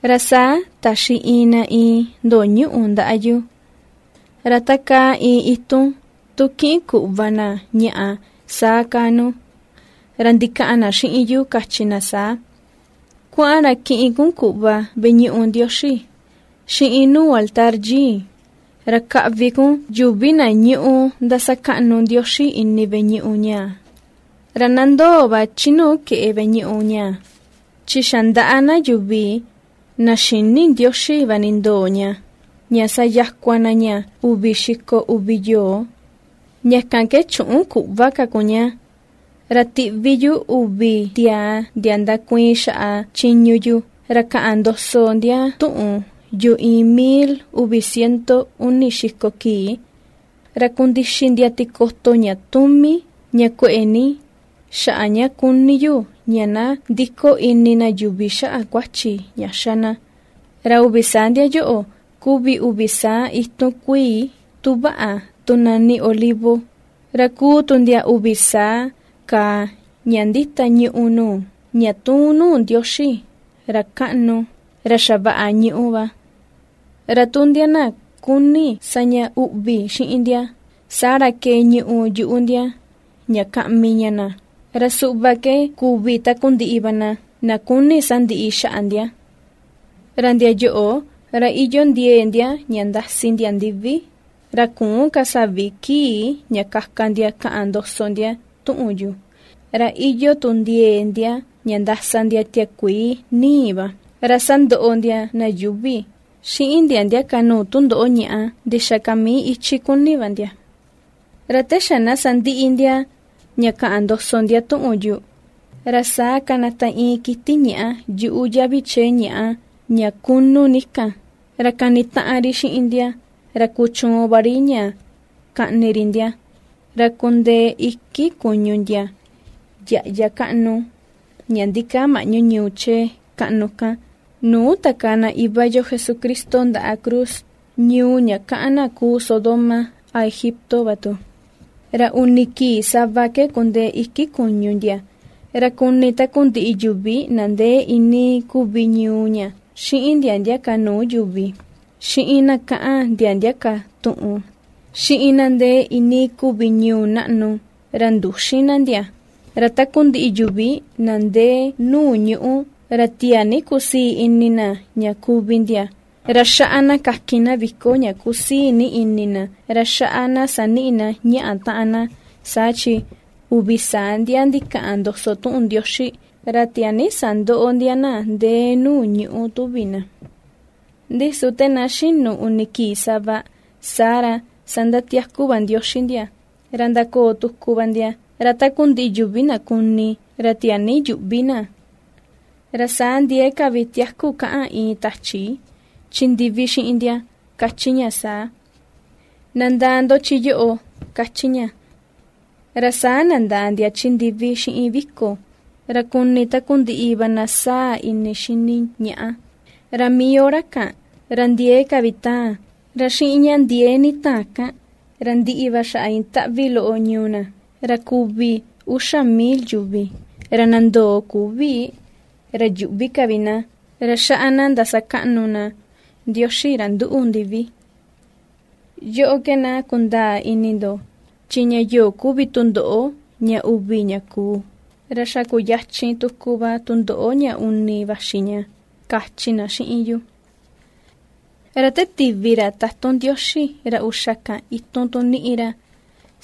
Ra saa taxi iin na iin ndo̱o̱ ñuꞌu ndaa yu, ra ta kaa iin itun tu kiꞌin kuꞌva na ñaꞌa, saa kaa nu, ra ndikaꞌan na xiꞌin yu kachi na saa: ―Kuaꞌan ra kiꞌin kun kuꞌva veꞌe ñuꞌu Ndioxi, xiꞌin nuu altar yii, ra kaꞌvi kun yuvi na ñúꞌu ndasakaꞌnu Ndioxi ini veꞌe ñuꞌu ñaa. Ra na ndoo va chi nuu keꞌe veꞌe ñuꞌu ñaa, chi xa ndaꞌa na yuvi, na xïni Ndioxi va nindoo ña, ña sayakua na ña uvi xiko uvi yoo. Ña kan ke chüꞌun kuꞌva ka kun ña. Ra tiꞌví yu uvi tiaa ndia ndakuiin xaꞌa chiñu yu, ra kaꞌan ndoso ndia tuꞌun yu iin mil uvi ciento uni xiko kii, ra kundixi ndia tikoto ña tumi, ña kueꞌe ní, xaꞌa ña kuni yu ña na ndiko ini na yuvi xaꞌa kuachi ña xá na. Ra uvi saa ndia yoꞌo kuvi uvi saa itun kuii, tu vaꞌa, tu nani olivo, ra kuu tu ndia uvi saa kàà ña ndita ñùꞌù nuu, ña tuun nuu Ndioxi ra kaꞌnu ra xavaꞌa ñuꞌú va. Ra tu ndia na kuni sa ña uꞌvi xiꞌin ndia, saa ra kee ñuꞌù yuꞌu ndia ña kaꞌmi ña na; ra suꞌva ke kuvi takundiꞌi va na kuni sandiꞌi xaꞌa ndia. Ra ndia yoꞌo, ra iyoo ndiee ndia ña ndasi ndia ndivi, ra küun ka savi kii ña kaka ndia kaꞌan ndoso ndia tuꞌun yu, ra iyoo tu ndiee ndia ña ndasa ndia tiakuii ni̱i̱ va, ra sandoꞌo ndia na yuuvi, xiꞌin ndia ndia ka nuu tundoꞌo ñàꞌa ndixaa ka mii ichi kuni va ndia. Ra te xa na sandiꞌi ndia ña kaꞌan ndoso ndia tuꞌun yu, ra saa kanata iin kiti ñàꞌa yuꞌu yavi chee ñàꞌa ña kunu ni kan, ra kanitaꞌan ri xiꞌin ndia, ra kuchuun va ri ña kaꞌni ri ndia. Ra kundee iki kuñu ndia yaꞌya kaꞌnu, ña ndikaa maꞌñu ñuu chee kaꞌnu kan, nuu takaa na Iva yo Jesucristo ndaꞌa cruz; ñuu ña ^kaꞌan na kuu “Sodoma” a “Egipto” va tu. Ra uni kii sava ke kundee iki kuñu ndia, ra kuni takundiꞌi yuvi na ndee iinii kuvi ñuu ña, xiꞌin ndia ndia ka nuu yuvi, xiꞌin na ^kaꞌan ndia ndia ka tuꞌun, xiꞌin na ndee iinii kuvi ñuu naꞌnu, ra ndüxin na ndia. Ra takundiꞌi yuvi na ndee nuu ñuꞌú, ra tiaa ni kusii ini na ña kuvi ndia, ra xaꞌa na kakin na viko ña kusii ní ini na, ra xaꞌa na saniꞌi na ñaꞌa taꞌan na, saa chi uvi saa ndia ndikaꞌan ndoso tuꞌun Ndioxi, ra tiaa ni sandoꞌo ndia na ndee nuu ñuꞌú tuvi na. Ndi su te na xinu uni kii sava, saa ra sandatiaku va Ndioxi ndia, ra ndakoo tuku va ndia, ra takundiꞌi yuvi na kuni, ra tiaa ni yuꞌvi na. Ra saa ndiee ka vi tiaku kaꞌan iin tachi, chi ndivi xiꞌin ndia, kachi ña saa: ―¡Na ndaa ndo chi yoꞌo! ―kachi ña. Ra saa nandaa ndia chi ndivi xiꞌin viko, ra kuni takundiꞌi va na sáa̱ ini xini ñaꞌa. Ra mii hora kan, ra ndiee ka vi taan, ra xiꞌin ña ndiee ni taan kan ra ndiꞌi va xaꞌa iin taꞌvi loꞌo ñuu na, ra kuvi uxa mil yuvi. Ra na ndoo, küvi, ra yuꞌvi ka vi na, ra xaꞌa na ndasakaꞌnu na Ndioxi, ra nduꞌu ndivi. Yoꞌo ke na kundaa ini ndo, chi ña yoꞌo kuvi tundoꞌo ña uvi ña kuu, ra xa kuyachin tuku va tundoꞌo ña uni vaxi ña ―kachi na xiꞌin yu. Ra te tivi ra tatun Ndioxi ra uxa kan itun tu niꞌi ra,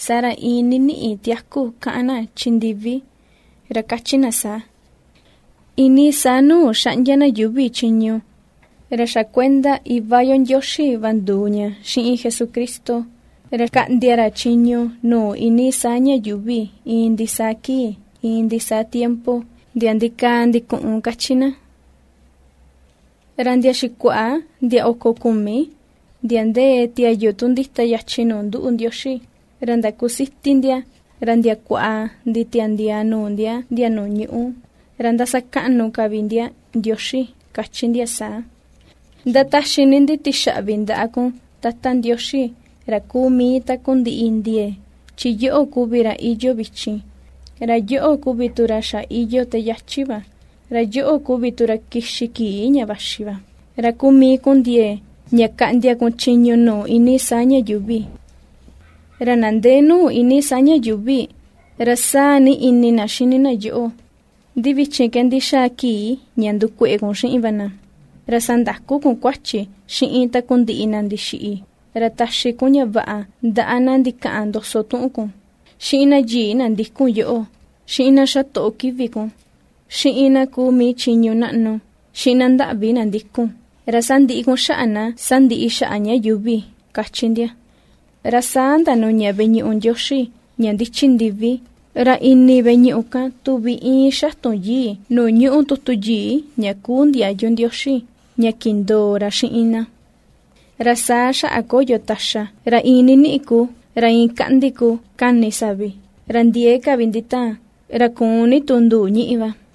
saa ra iin niniꞌi tiaku kaꞌan na chi ndivi, ra kachi na saa: Iinii saa nuu ^xaꞌndia na yuuvi chiñu, ra xa kuenda Iva yo Ndioxi va nduu ña xiꞌin Jesucristo, ra kaꞌndia ra chiñu nuu iinii saa ña yuuvi iin ndisaa kii, iin ndisaa tiempo, ndia ndikaa ndikuꞌun, ^kachi na. Ra ndia xikuaꞌa ndia oko kumi, ndia ndee tiayu tu ndita yachin nuu nduꞌu Ndioxi, ra ndakusiti ndia, ra ndiakua nditiandiaa nuu ndia ndia nuu ñuꞌú, ra ^ndasakaꞌnu ka vi ndia Ndioxi, kachi ndia saa: Ndataxi ni ndi tixaꞌvi ndaꞌa kun, Tata Ndioxi, ra kuu mii takundiꞌi ndiee, chi yoꞌo kuvi ra iyoo vichin, ra yoꞌo kuvi tu ra xa iyoo te yachi va, ra yoꞌo kuvi tu ra kixi kii ña vaxi va, ra kuu mii kun ndiee, ña kaꞌndia kun chiñu nuu iinii saa ña yuuvi. Ra na ndee nuu iinii saa ña yuuvi, ra sáa̱ ni ini na xini na yoꞌo, ndi vichin ke ndixaa kii ña ndukueꞌe kun xiꞌin va na. Ra sandaku kun kuachi xiꞌin takundiꞌi na ndixiꞌi, ra taxi kun ña vaꞌa ndaꞌa na ndikaꞌan ndoso tuꞌun kun, xiꞌin na yii na ndikun yoꞌo, xiꞌin na xatoꞌo kivi kun, xiꞌin na kuu mii chiñu naꞌnu, xiꞌin na ndaꞌvi na ndikun; ra sandiꞌi kun xaꞌa na ^sandiꞌi xaꞌa ña yuuvi, ^kachi ndia. Ra saa ndanuña veꞌe ñuꞌu Ndioxi ña ndichi ndivi, ra ini veꞌe ñuꞌu kan tuvi íin xatun yii nuu ñúꞌu tutu yii ña kuu ndiayu Ndioxi ña kindoo ra xiꞌin na. Ra saa xaꞌa koyo taxa, ra iin niniꞌi kuu, ra iin kaꞌndi kuu kani savi, ra ndiee ka vi nditaan, ra ku̱u̱n ní tu nduu ñíꞌi va.